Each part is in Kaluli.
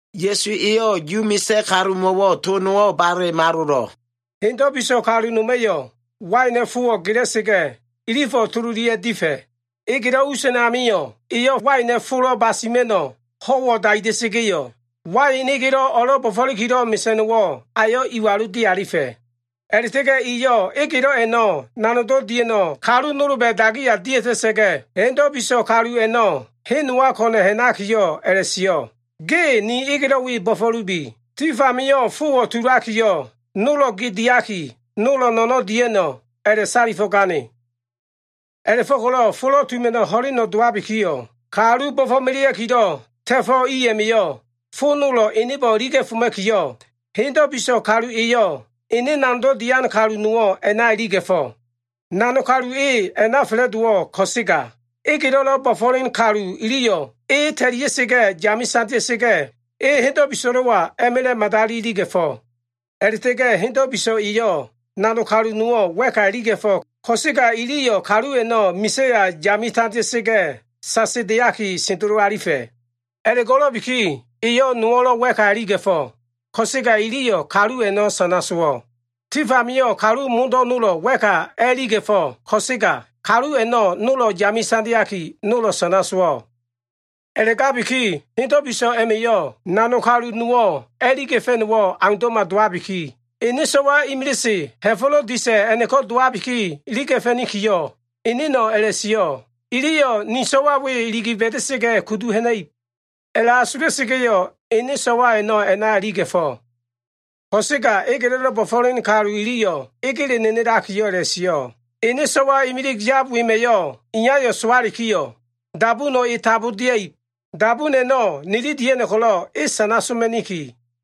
Ya꞉su eyo꞉ Yu misa꞉ kalumo꞉wo꞉ to nowo꞉ bale malolo꞉. “Hendo꞉ biso꞉ kalu noma꞉yo꞉ waina꞉ fowo꞉ gela꞉sa꞉ga꞉, ilifo꞉ tololia꞉ difa꞉. Egelo꞉ us a꞉namio꞉, eyo꞉ waina꞉ folo꞉ basima꞉no꞉ ho꞉wo꞉ daida꞉sa꞉ga꞉yo꞉, wain egelo꞉ o꞉lo꞉ bo꞉fo꞉likilo꞉ mesa꞉no꞉wo꞉ ayo꞉ iwalu dialifa꞉. A꞉la꞉ta꞉ga꞉ eyo꞉ egelo꞉ a꞉no꞉ nanogdo꞉ dia꞉no꞉ kalu nolba꞉ dagiya dia꞉ta꞉sa꞉ga꞉, hendo꞉ biso꞉ kalu a꞉no꞉ hen nowa ko꞉na꞉ ha꞉nakiyo꞉ a꞉la꞉sio꞉, ‘Ge ni egelo꞉ we bo꞉fo꞉lubi. Tif amio꞉ fowo꞉ tulakiyo꞉, nolo꞉ ge diaki, nolo꞉ no꞉no꞉ dia꞉no꞉’ a꞉la꞉salifo꞉gane. A꞉la꞉fo꞉ko꞉lo꞉ folo꞉ tuma꞉no꞉ ho꞉leno꞉ dowabikiyo꞉, kalu bo꞉fo꞉melea꞉kilo꞉ ta꞉fo꞉ i a꞉ma꞉yo꞉ fo nolo꞉ enebo꞉ iliga꞉foma꞉kiyo꞉, hendo꞉ biso꞉ kalu eyo꞉ ene nanogdo꞉ dian kalu nowo꞉ a꞉na iliga꞉fo꞉. Nanog kalu e a꞉na fa꞉la꞉dowo꞉ ko꞉sega, egelo꞉lo꞉ bo꞉fo꞉len kalu iliyo꞉ e ta꞉lia꞉sa꞉ga꞉ yame tandea꞉sa꞉ga꞉, e hendo꞉ biso꞉lo꞉wa a꞉ma꞉la꞉ madali iliga꞉fo꞉. A꞉la꞉ta꞉ga꞉ hendo꞉ biso꞉ eyo꞉ nanog kalu nowo꞉ wa꞉ka iliga꞉fo꞉, ko꞉sega iliyo꞉ kalu a꞉no꞉ misa꞉ya yame tandea꞉sa꞉ga꞉, sasedeaki sendelo alifa꞉. A꞉la꞉go꞉lo꞉biki eyo꞉ nowo꞉lo꞉ wa꞉ka iliga꞉fo꞉ ko꞉sega, iliyo꞉ kalu a꞉no꞉ sana sowo꞉. Tif amio꞉ kalu modo꞉ nolo꞉ wa꞉ka a꞉iliga꞉fo꞉, ko꞉sega kalu a꞉no꞉ nolo꞉ yame tandeaki, nolo꞉ sana sowo꞉. “A꞉la꞉gabiki hendo꞉ biso꞉ a꞉ma꞉yo꞉ nanog kalu nowo꞉ a꞉iliga꞉fa꞉no꞉wo꞉ aundo꞉ma dowabiki, ene so꞉wa imilise ha꞉fo꞉lo꞉ disa꞉ a꞉no꞉ko꞉ dowabi iliga꞉fa꞉nikiyo꞉, eneno꞉ a꞉la꞉sio꞉, ‘Iliyo꞉ ne so꞉wa we iligi ba꞉da꞉sa꞉ga꞉, kudu ha꞉na꞉ib.’ A꞉la꞉asula꞉sa꞉ga꞉yo꞉, ene so꞉wa a꞉no꞉ a꞉na iliga꞉fo꞉. Ko꞉sega egelo꞉lo꞉ bo꞉fo꞉len kalu iliyo꞉ egele nenelakiyo꞉ a꞉la꞉sio꞉, ‘Ene so꞉wa imilig yab wema꞉yo꞉, iyayo꞉ sowalikiyo꞉ dabuno꞉ e tambo dia꞉ib. Dabun a꞉no꞉ nili dia꞉no꞉ ko꞉lo꞉ e sana soma꞉niki.’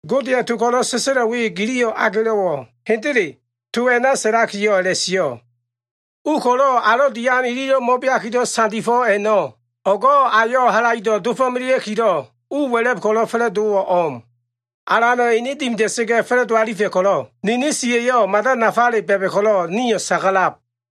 Godeya꞉ to ko꞉lo꞉ sa꞉sa꞉lo꞉ we giliyo꞉ agelo꞉wo꞉? Hendele, to a꞉na sa꞉lakiyo꞉ a꞉la꞉sio꞉, “ ‘U ko꞉lo꞉ alo꞉ dian ililo꞉ mo꞉beakilo꞉ sandifo꞉ a꞉no꞉, o꞉go꞉ ayo꞉ halaido꞉ dofo꞉melea꞉kilo꞉ u wa꞉la꞉b ko꞉lo꞉ fa꞉la꞉dowo꞉wo꞉ o꞉m. Alana꞉ ene dimida꞉sa꞉ga꞉ fa꞉la꞉do alifa꞉ ko꞉lo꞉, nini siya꞉yo꞉ mada nafa ba꞉ba꞉ ko꞉lo꞉ nio꞉ sagalab.’”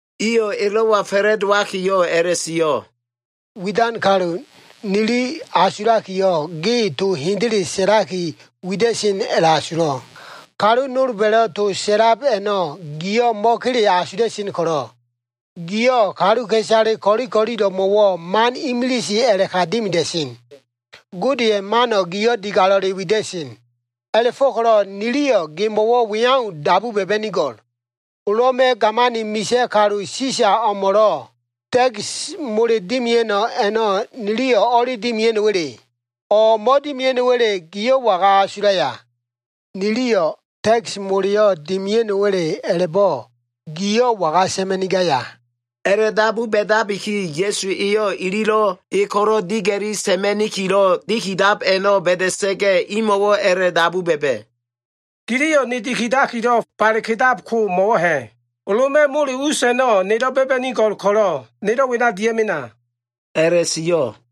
Iyo꞉ elo꞉wa fa꞉la꞉dowakiyo꞉ a꞉la꞉sio꞉, “Widan kalu, nili asulakiyo꞉, ge to hendele sa꞉laki wida꞉sen a꞉la꞉asulo꞉. Kalu nolba꞉lo꞉ to sa꞉lab a꞉no꞉ giyo꞉ mo꞉kele asula꞉sen ko꞉lo꞉, giyo꞉ kaluka꞉isale ko꞉li ko꞉lilo꞉mo꞉wo꞉ man imilise a꞉la꞉ka dimida꞉sen. Godeya꞉ mano꞉ giyo꞉ digalo꞉le wida꞉sen. A꞉la꞉fo꞉ko꞉lo꞉ niliyo꞉ gemo꞉wo꞉ we au dabu ba꞉ba꞉nigo꞉l. Loma꞉ gamani misa꞉ kalu alan, Sisa o꞉mo꞉lo꞉ takis mole dimia꞉no꞉ a꞉no꞉ niliyo꞉ o꞉li dimia꞉no꞉wa꞉le? O꞉ mo꞉dimia꞉no꞉wa꞉le, giyo꞉ waga asulaya? Niliyo꞉ takis moleyo꞉ dimia꞉no꞉wa꞉le a꞉la꞉bo꞉, giyo꞉ waga sa꞉ma꞉nigaya?” A꞉la꞉dabu ba꞉dabiki, Ya꞉su eyo꞉ ililo꞉ e ko꞉lo꞉ diga꞉li sa꞉ma꞉nikilo꞉ dimidab a꞉no꞉ ba꞉da꞉sa꞉ga꞉, imo꞉wo꞉ a꞉la꞉dabu ba꞉ba꞉, “Giliyo꞉ ne dikidakilo꞉ bale kedako, mo꞉wo꞉ ha꞉? Loma꞉ mole us a꞉no꞉ nelo꞉ ba꞉ba꞉nigo꞉l ko꞉lo꞉, nelo꞉ wena dia꞉mena” a꞉la꞉sio꞉.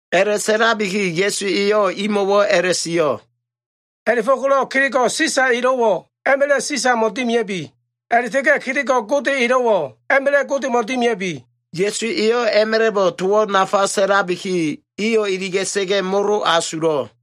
A꞉la꞉sa꞉labiki Ya꞉su eyo꞉ imo꞉wo꞉ a꞉la꞉sio꞉, “A꞉la꞉fo꞉ko꞉lo꞉ kelego꞉ Sisa elo꞉wo꞉, a꞉ma꞉la꞉ Sisamo꞉ dimia꞉bi. A꞉la꞉ta꞉ga꞉ kelego꞉ Gode elo꞉wo꞉, a꞉ma꞉la꞉ Godemo꞉ dimia꞉bi.” Ya꞉su eyo꞉ a꞉ma꞉la꞉bo꞉ towo꞉ nafa sa꞉labi, iyo꞉ iliga꞉sa꞉ga꞉ molo asulo꞉.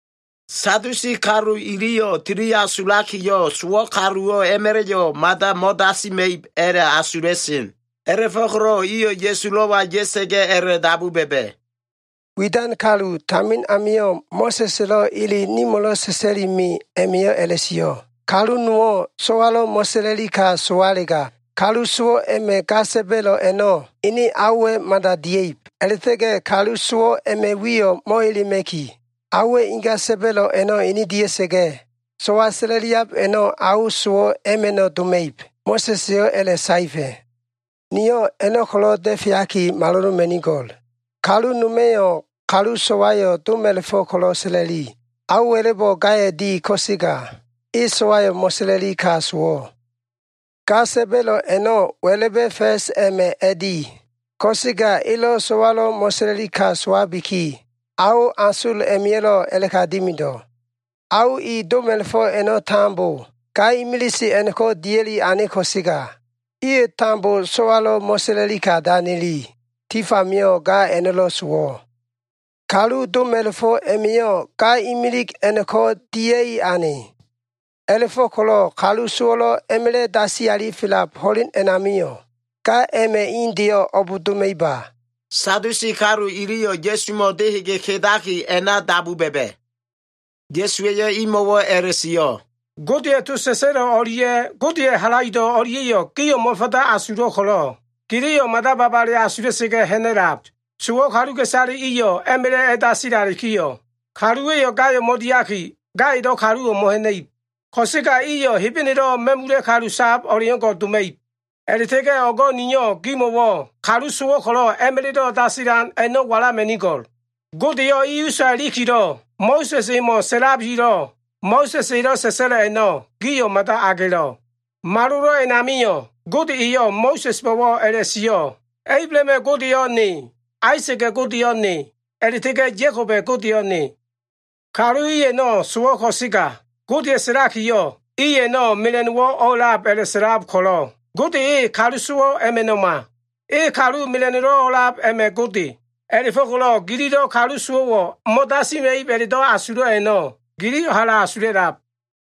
Sadusi kalu iliyo꞉ tili asulakiyo꞉, sowo꞉ kaluwo꞉ a꞉ma꞉la꞉yo꞉ mada mo꞉dasima꞉ib a꞉la꞉asula꞉sen. A꞉la꞉fo꞉ko꞉lo꞉ iyo꞉ Ya꞉sulo꞉wa ya꞉sa꞉ga꞉ a꞉la꞉dabu ba꞉ba꞉. “Widan kalu, tamin amio꞉ Mo꞉sa꞉s elo꞉ ele nimo꞉lo꞉ sa꞉sa꞉li me a꞉ma꞉yo꞉ a꞉la꞉sio꞉, ‘Kalu nowo꞉ so꞉walo꞉ mo꞉sa꞉la꞉li ka sowalega, kalu sowo꞉ a꞉ma꞉ ga sa꞉ba꞉lo꞉ a꞉no꞉, ene aowa꞉ mada dia꞉ib. A꞉la꞉ta꞉ga꞉ kalu sowo꞉ a꞉ma꞉ wiyo꞉ mo꞉elema꞉ki, aowa꞉ inga sa꞉ba꞉lo꞉ a꞉no꞉ ene dia꞉sa꞉ga꞉, so꞉wa sa꞉la꞉liab a꞉no꞉, ao sowo꞉ a꞉ma꞉ no꞉ doma꞉ib.’ Mo꞉sa꞉s eyo꞉ a꞉la꞉saefa꞉. “Nio꞉ a꞉no꞉ ko꞉lo꞉ da꞉feaki maloloma꞉nigo꞉l. Kalu noma꞉yo꞉ kalu so꞉wayo꞉ doma꞉la꞉fo꞉ ko꞉lo꞉ sa꞉la꞉li. Ao wa꞉la꞉bo꞉ gayo꞉ di, ko꞉sega e so꞉wayo꞉ mo꞉sa꞉la꞉li ka sowo꞉. Ga sa꞉ba꞉lo꞉ a꞉no꞉ wa꞉la꞉ba꞉ fa꞉s a꞉ma꞉ a꞉di, ko꞉sega elo꞉ so꞉walo꞉ mo꞉sa꞉la꞉li ka sowabiki, ao asol a꞉ma꞉yo꞉lo꞉ a꞉la꞉ka dimido꞉. Ao i doma꞉la꞉fo꞉ a꞉no꞉ tambo ga imilise a꞉no꞉ko꞉ dia꞉li ane ko꞉sega, iyo꞉ tambo so꞉walo꞉ mo꞉sa꞉la꞉li ka danili. Tif amio꞉ ga a꞉no꞉lo꞉ sowo꞉. Kalu doma꞉la꞉fo꞉ a꞉ma꞉yo꞉ ga imilig a꞉no꞉ko꞉ dia꞉i ane. A꞉la꞉fo꞉ko꞉lo꞉ kalu sowo꞉lo꞉ a꞉ma꞉la꞉ dasi alifelab ho꞉len a꞉namio꞉, ga a꞉ma꞉ indeyo꞉ o꞉b doma꞉iba?” Sadusi kalu iliyo꞉ Ya꞉sumo꞉ dehege kedaki a꞉na dabu ba꞉ba꞉. Ya꞉su eyo꞉ imo꞉wo꞉ a꞉la꞉sio꞉, “Godeya꞉ to sa꞉sa꞉lo꞉ o꞉lia꞉ Godeya꞉ halaido꞉ o꞉lia꞉yo꞉ gio꞉ mo꞉fanda asulo꞉ ko꞉lo꞉, giliyo꞉ mada babale asula꞉sa꞉ga꞉ ha꞉na꞉lab. Sowo꞉ kaluka꞉isale iyo꞉ a꞉ma꞉la꞉ a꞉dasilalikiyo꞉, kaluwa꞉yo꞉ gayo꞉ mo꞉diaki, gaya꞉lo꞉ kaluwo꞉ mo꞉ha꞉na꞉ib. Ko꞉sega iyo꞉ Hebenelo꞉ ma꞉mula꞉ kalu sab o꞉leo꞉ngo꞉ doma꞉ib. A꞉la꞉ta꞉ga꞉ o꞉go꞉ niyo꞉ gimo꞉wo꞉ kalu sowo꞉ ko꞉lo꞉ a꞉ma꞉la꞉do꞉ dasilan a꞉no꞉ walama꞉nigo꞉l. Godeyo꞉ i usa ilikilo꞉ Mo꞉sa꞉s emo꞉ sa꞉labilo꞉, Mo꞉sa꞉s elo꞉ sa꞉sa꞉lo꞉ a꞉no꞉ gio꞉ mada agelo꞉. Malolo꞉ a꞉namio꞉, Gode eyo꞉ Mo꞉sa꞉sbo꞉wo꞉ a꞉la꞉sio꞉, ‘Ablahama꞉ Godeyo꞉ Ne, Aisa꞉ga꞉ Godeyo꞉ Ne, a꞉la꞉ta꞉ga꞉ Ya꞉koba꞉ Godeyo꞉ Ne.’ Kalu i a꞉no꞉ sowo꞉ ko꞉sega Godeya꞉ sa꞉lakiyo꞉ i a꞉no꞉ mela꞉no꞉wo꞉ o꞉lab a꞉la꞉sa꞉lab ko꞉lo꞉ Gode e kalu sowo꞉ a꞉ma꞉no꞉ma. E kalu mela꞉no꞉lo꞉ a꞉lab a꞉ma꞉ Gode. A꞉la꞉fo꞉ko꞉lo꞉ gililo꞉ kalu sowo꞉wo꞉ mo꞉dasima꞉ib a꞉la꞉do꞉ asulo꞉ a꞉no꞉, giliyo꞉ hala asula꞉lab.”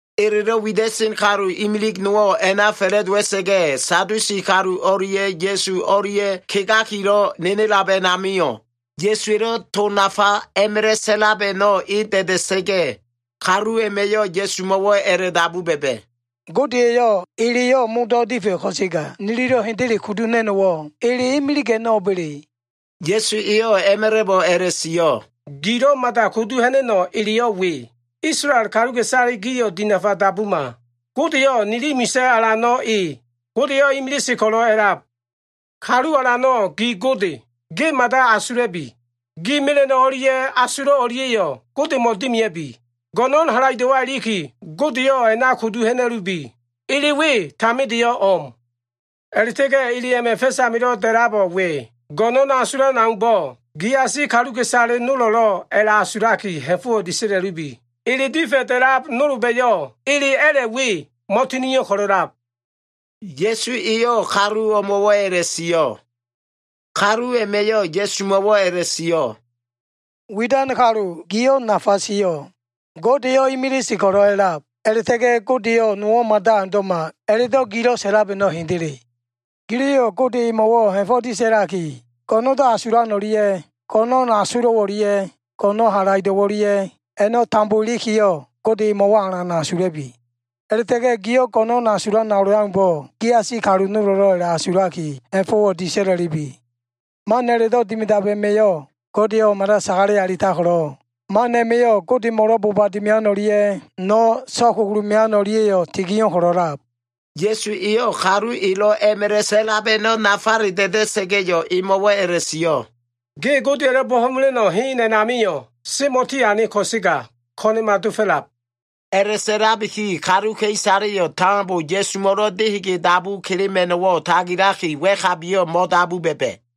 Elelo꞉ wida꞉sen kalu imilig nowo꞉ a꞉na fa꞉la꞉dowa꞉sa꞉ga꞉, Sadusi kalu o꞉lia꞉ Ya꞉su o꞉lia꞉ kegakilo꞉ nenelab a꞉namio꞉, Ya꞉suwa꞉lo꞉ to nafa a꞉ma꞉la꞉ sa꞉lab a꞉no꞉ e da꞉da꞉sa꞉ga꞉, kalu a꞉ma꞉yo꞉ Ya꞉sumo꞉wo꞉ a꞉la꞉dabu ba꞉ba꞉, “Gode eyo꞉ eleyo꞉ modo꞉ difa꞉ ko꞉sega, nililo꞉ hendele kudu ha꞉na꞉no꞉wo꞉ ele imilig a꞉no꞉ o꞉ba꞉le?” Ya꞉su eyo꞉ a꞉ma꞉la꞉bo꞉ a꞉la꞉sio꞉, “Gilo꞉ mada kudu ha꞉na꞉no꞉ eleyo꞉ we, ‘Isolael kaluka꞉isale gio꞉ dinafa dabuma. Godeyo꞉ nili misa꞉ Alano꞉ e. Godeyo꞉ imilise ko꞉lo꞉ a꞉lab. Kalu Alano꞉ gi Gode, ge mada asula꞉bi. Gi mela꞉no꞉ o꞉lia꞉ asulo꞉ o꞉lia꞉yo꞉ Godemo꞉ dimia꞉bi. Go꞉no꞉n halaido꞉wa꞉ iliki, Godeyo꞉ a꞉na kudu ha꞉na꞉lubi.’ Ele we tamindeyo꞉ o꞉m. A꞉la꞉ta꞉ga꞉ ele a꞉ma꞉ fa꞉s amilo꞉ da꞉labo꞉ we, ‘Go꞉no꞉n asulan o꞉leaumbo꞉, giasi kaluka꞉isale nolo꞉lo꞉ a꞉la꞉asulaki ha꞉fo꞉wo꞉ disa꞉la꞉lubi.’ Ele difa꞉ da꞉lab nolba꞉yo꞉ ele a꞉la꞉ we, mo꞉tinio꞉ ko꞉lo꞉ a꞉lab.” Ya꞉su eyo꞉ kalu o꞉mo꞉wo꞉ a꞉la꞉sio꞉. Kalu a꞉ma꞉yo꞉ Ya꞉sumo꞉wo꞉ a꞉la꞉sio꞉, “Widan kalu, giyo꞉ nafa sio꞉. Godeyo꞉ imilise ko꞉lo꞉ a꞉lab, a꞉la꞉ta꞉ga꞉ Godeyo꞉ nowo꞉ mada aundo꞉ma a꞉la꞉do꞉ gilo꞉ sa꞉lab a꞉no꞉ hendele. Giliyo꞉ Gode emo꞉wo꞉ ha꞉fo꞉ disa꞉laki, go꞉no꞉ndo꞉ asulan o꞉lia꞉, go꞉no꞉n asulo꞉ o꞉lia꞉, go꞉no꞉n halaido꞉ o꞉lia꞉ a꞉na tambo ilikiyo꞉, Gode emo꞉wo꞉ alan asula꞉bi. A꞉la꞉ta꞉ga꞉ gio꞉ go꞉no꞉n asulan o꞉leaumbo꞉, giasi kaluka꞉isale nolo꞉lo꞉ a꞉la꞉asulaki ha꞉fo꞉wo꞉ disa꞉la꞉lubi. Man a꞉la꞉do꞉ dimidab a꞉ma꞉yo꞉ Godeyo꞉ mada sagale alitab ko꞉lo꞉, man a꞉ma꞉yo꞉ Godemo꞉lo꞉ boba dimian o꞉lia꞉ no꞉ so꞉kugulu mean o꞉lia꞉yo꞉ tinio꞉ ko꞉lo꞉lab.” Ya꞉su eyo꞉ kalu elo꞉ a꞉ma꞉la꞉ sa꞉lab a꞉no꞉ nafale da꞉da꞉ga꞉yo꞉, emo꞉wo꞉ a꞉la꞉sio꞉, “Ge Godeya꞉lo꞉ bo꞉fo꞉mela꞉no꞉ hen a꞉namio꞉ semo꞉ tiane ko꞉sega ko꞉na꞉ma dofo꞉lab.” A꞉la꞉sa꞉labiki kaluka꞉isaleyo꞉ tambo Ya꞉sumo꞉lo꞉ dehege dabu kelema꞉no꞉wo꞉ tagilaki, wa꞉kabiyo꞉ mo꞉dabu ba꞉ba꞉.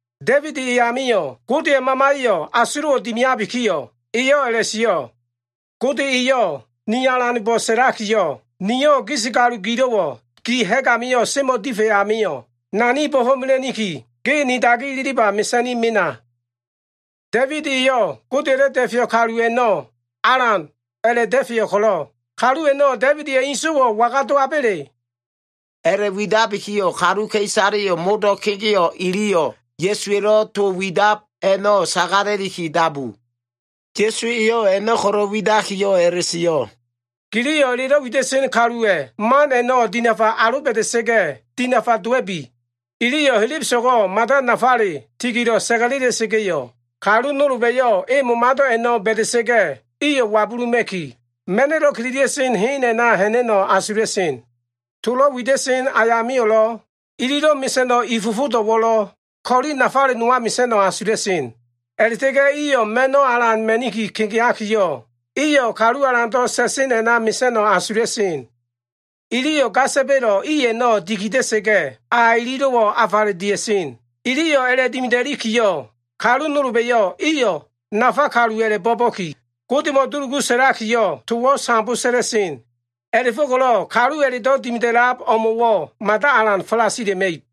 Da꞉ibid eyamio꞉ Godeya꞉ Mamaya꞉yo꞉ asulo꞉wo꞉ dimiabikiyo꞉, eyo꞉ a꞉la꞉sio꞉, “Gode eyo꞉ ni Alanbo꞉ sa꞉lakiyo꞉, ‘Niyo꞉ gis kalu gilo꞉wo꞉ gi ha꞉g amio꞉ semo꞉ difa꞉ amio꞉, Nani bo꞉fo꞉mela꞉niki, ge ni dagi ililiba mesa꞉ni mena.’ Da꞉ibid eyo꞉ Godeya꞉lo꞉ Da꞉feyo꞉ kalu a꞉no꞉ ‘Alan’ a꞉la꞉ da꞉feyo꞉ ko꞉lo꞉, kalu a꞉no꞉ Da꞉ibida꞉ inso꞉wo꞉ waga dowaba꞉le?” A꞉la꞉widabiki kaluka꞉isale modo꞉ kegeo꞉ iliyo꞉ Ya꞉suwa꞉lo꞉ to widab a꞉no꞉ sagala꞉liki dabu. Ya꞉su eyo꞉ a꞉no꞉ ko꞉lo꞉ widakiyo꞉ a꞉la꞉sio꞉, “Giliyo꞉ elelo꞉ wida꞉sen kaluwa꞉ man a꞉no꞉ dinafa aloba꞉da꞉sa꞉ga꞉ dinafa dowa꞉bi. Iliyo꞉ helebeso꞉go꞉ mada nafale tigilo꞉ sa꞉ga꞉lela꞉sa꞉ga꞉yo꞉, kalu nolba꞉yo꞉ e momado꞉ a꞉no꞉ ba꞉da꞉sa꞉ga꞉ iyo꞉ wabuluma꞉ki, ma꞉no꞉lo꞉ kililia꞉sen hen a꞉na ha꞉na꞉no꞉ asula꞉sen. Tolo꞉ wida꞉sen ayamio꞉lo꞉, ililo꞉ mesa꞉no꞉ i fofodo꞉wo꞉lo꞉ ko꞉li nafale nowa mesa꞉no꞉ asula꞉sen. A꞉la꞉ta꞉ga꞉ ma꞉no꞉wo꞉ alan ma꞉ni kegeakiyo꞉, iyo꞉ kalu alando꞉ sa꞉sen a꞉na mesa꞉no꞉ asula꞉sen. Iliyo꞉ ga sa꞉ba꞉lo꞉ i a꞉no꞉ dikida꞉sa꞉ga꞉, a ililo꞉wo꞉ afale dia꞉sen. Iliyo꞉ a꞉la꞉dimida꞉likiyo꞉, kalu nolba꞉yo꞉ iyo꞉ nafa kalu a꞉la꞉bo꞉ba꞉ki, Godemo꞉ dulugu sa꞉lakiyo꞉, towo꞉ sambo sa꞉la꞉sen. A꞉la꞉fo꞉ko꞉lo꞉ kalu a꞉la꞉do꞉ dimida꞉lab o꞉mo꞉wo꞉ mada alan falasila꞉ma꞉ib.”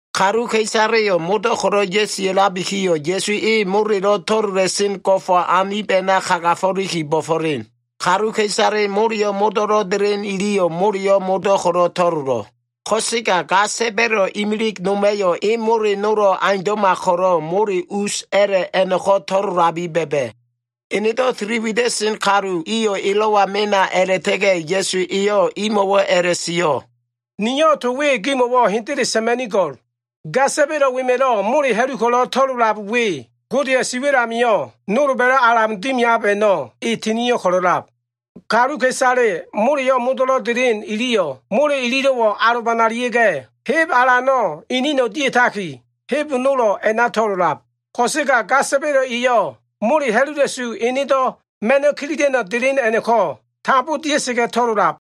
Kaluka꞉isaleyo꞉ modo꞉ ya꞉sia꞉labikiyo꞉, Ya꞉su e molelo꞉ to꞉lola꞉sen go꞉fo꞉ anib a꞉na kagafo꞉liki bo꞉fo꞉len. Kaluka꞉isale moleyo꞉ modo꞉lo꞉ delen iliyo꞉ moleyo꞉ modo꞉ ko꞉lo꞉ to꞉lolo꞉. Ko꞉sega ga sa꞉ba꞉lo꞉ imilig noma꞉yo꞉ e mole nolo꞉ aundo꞉ma ko꞉lo꞉ mole us a꞉la꞉ a꞉no꞉ko꞉ to꞉lolabi ba꞉ba꞉. Enedo꞉ tili wida꞉sen kalu iyo꞉ elo꞉wa mena a꞉la꞉ta꞉ga꞉, Ya꞉su eyo꞉ imo꞉wo꞉ a꞉la꞉sio꞉, “Niyo꞉ to we gimo꞉wo꞉ hendele sa꞉ma꞉nigo꞉l. Ga sa꞉ba꞉lo꞉ wema꞉lo꞉ mole ha꞉lu ko꞉lo꞉ to꞉lolab we, Godeya꞉ si wa꞉l amio꞉ nolba꞉lo꞉ alan dimiab a꞉no꞉ e tinio꞉ ko꞉lo꞉lab. Kaluka꞉isale moleyo꞉ modo꞉lo꞉ delen iliyo꞉, mole ililo꞉wo꞉ alobanalia꞉ga꞉, heb alano꞉ inino꞉ dia꞉taki, heb nolo꞉ a꞉na to꞉lolab. Ko꞉sega ga sa꞉ba꞉lo꞉ eyo꞉, mole ha꞉lula꞉su enedo꞉ ma꞉no꞉ kililia꞉no꞉ delen a꞉no꞉ko꞉ tambo dia꞉sa꞉ga꞉ to꞉lolab.”